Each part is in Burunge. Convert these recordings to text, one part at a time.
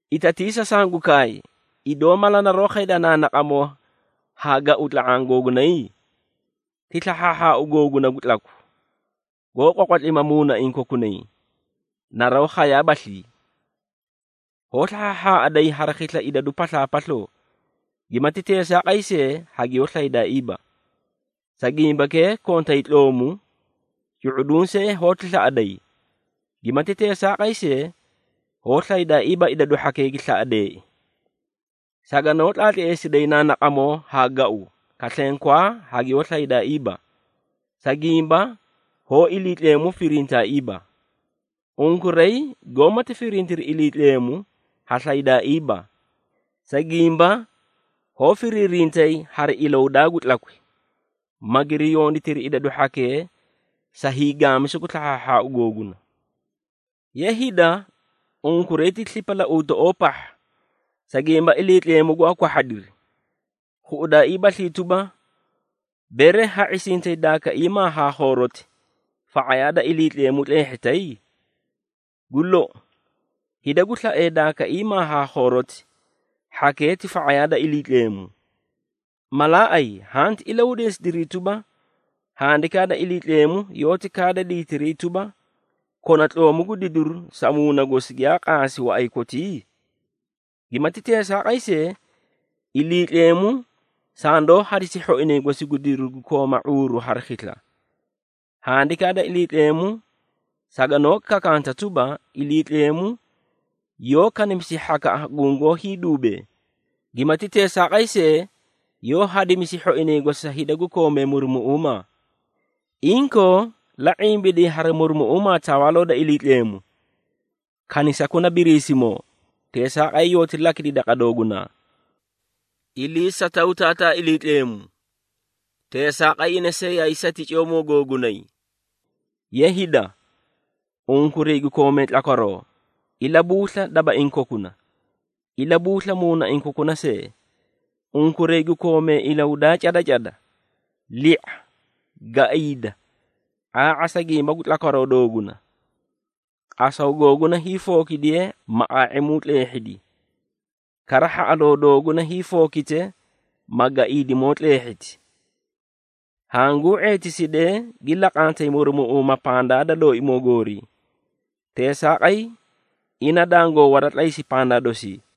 Itatiisa sangu kaay, idoo mala naroó khayda naanaqamoo haa gau tla⁄aã googunay? Ti slahhaahhaau googuna gu tlaku, goó qwaqwatlima muunaiĩ kokunay, naroó khayaabaslii? Hoó slahhaahhaaꞌaday hari khisla idadu paslaapasloo, gimati teesaaqay see, hagiyoó slaydaaiiba. Sa gimbakee kontay tloomu, cu⁄uduũ see hoóti slaꞌaday, gimati teesaaqay see, hoó slaydaaiiba idadu hhakee gi slaꞌadeei. Saganoó tlaatleesiday naanaqamoo haa gau, kaslenkwaa, hagiyoó slaydaaiiba, sa gimba hoó Iliitleemu firintaaiiba. Unkuray goómati firintiri Iliitleemu, ha slaydaaiiba, sa gimba hoó firiirintay hari ilahudaa gu tlakwi, magiri yonditiri idadu hhakee sa hiigaamisu gu slahhaahhaau googuna. Ye hida, unkuray ti slipalauutoꞌoo pahha, sa gimba Iliitleemu gwaa kwahhadiri. Khuꞌudaaiibaslii tuba, bere ha ⁄isintay daakaiimaa haa khooroti, fa⁄ayaa da Iliitleemu tleehhitay? Gu lou, hida gu slaee daakaiimaa haa khooroti, hhakee ti fa⁄ayaa da Iliitleemu. Malaaꞌay, hanti ilahudeesidiri tuba, Handikaa da Iliitleemu yoóti kaada diitiray tuba, “Kona tloomu gu didiru sa muuna gosi giyaa qaasi waꞌay kotii?” Gimati teesaaqay see, Iliitleemu sandoó hadisi hhoinay gosi gu didiru gu kooma ⁄uuru hari khisla. Handikaa da Iliitleemu saganoó kakanta tuba, “Iliitleemu yoó kanimisi hhakaꞌa gungoó hiiduubee, gimati teesaaqay see, yoó hadimisi hhoinay gosi sa hida gu koomee murumuꞌuumaa.” Inkoo, la ⁄imbiday hari murumuꞌuumaa Tawaaloo da Iliitleemu. Kanisakuna Biriisimoo, teesaaqay yooti lakidi daqa doogunaa. Iliisataw Taataa Iliitleemu, teesaaqay ina see yaay sati ciyoomoo googunay. Ye hida, unkuray gu koomee tlakwaroo, ilabuusla dabaiĩ kokuna. Ilabuusla muunaiĩ kokuna see, unkuray gu koomee ilahudaa cada cada. Li⁄a, gaiida, ⁄aa⁄a sa gimba gu tlakwaroo dooguna. Qasaw googuna hiifookidiye, ma ⁄aa⁄imuu tleehhidi, kara hhaꞌaloo dooguna hiifookite, ma gaiidimoo tleehhiti. Hanguu ⁄eetisidee gi laqantay murumuꞌuumaa pandaa da Looimoo goori. Teesaaqay, ina dangoo waratlaysi pandaa dosii.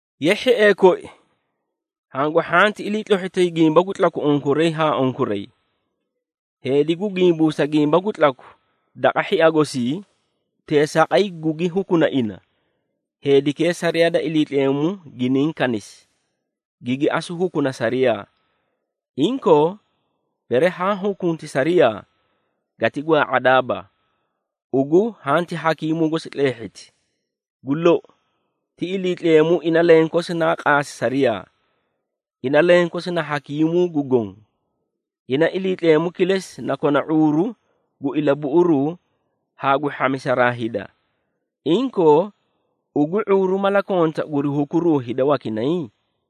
Ye hhiee koi, hangu hhanti iliitlohhitay gimba gu tlaku unkuray haa unkuray. Heedi gu gimbuusa gimba gu tlaku daqa hhia gosii, teesaaqay gugi hukuna ina, heedikee sariyaa da Iliitleemu giniĩ kanisi, gigi asu hukuna sariyaa. Inkoo, bere haã hukunti sariyaa, gati gwaa⁄adaaba, ugu hanti hakiimuu gosi tleehhiti. Gu lou, ti Iliitleemu ina lenkosi naa qaasi sariyaa, ina lenkosi na hakiimuu gu goõ. Ina Iliitleemu kilesi na kona ⁄uuru gu ilabuꞌuruu haa gu hhamisaraa hida. Inkoo, ugu, ⁄uuru mala konta guri hukuruu hida wakinay?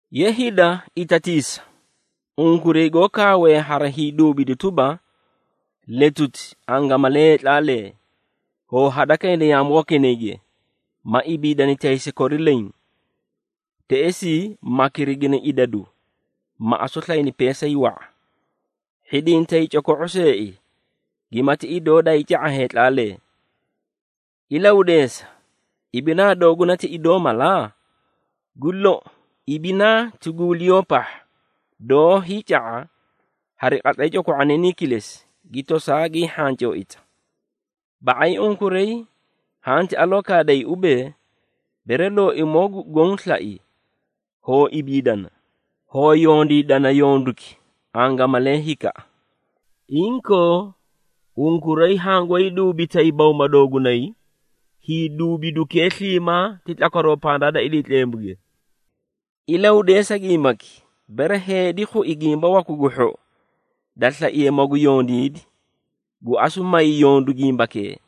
Ye hida, itatiisa, unkuray goó kaawee hari hiiduubidu tuba, “Letuti, angamalee heetlaalee, hoo hadakayna yaamu wakinayge, ma ibiidani taysi kori leẽ. Teꞌesii, ma kirigini idadu, ma asu slayni peesay wa⁄a.” Hhidintay coko⁄o seei, gimati idoo daayii ca⁄a heetlaalee! Ilahudeesa, ibinaa dooguna ti idoo mala? Gu lou, ibinaa ti guuliyoo pahha, doó hiica⁄a hari qatlay coko⁄oniinii kilesi, gi tosaa gii hhancooita. Ba⁄ay unkuray hanti aloo kaaday ubee, “Bere Looimoo gu Goõ slai, hoo ibiidana, hoo yondiidana yonduki, angamalee hikaꞌa.” Inkoo, unkuray hangoóyi duubitay bawma doogunay. Hiiduubidukee sliimaa ti tlakwaroo pandaa da Iliitleemuge. Ilahudeesa gimbaki: bere heedi khui gimba waku gu hhou, da slaiye magu yondiidi, gu asu may yondu gimbakee,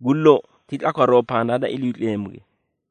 gu lou, ti tlakwaroo pandaa da Iliitleemuge.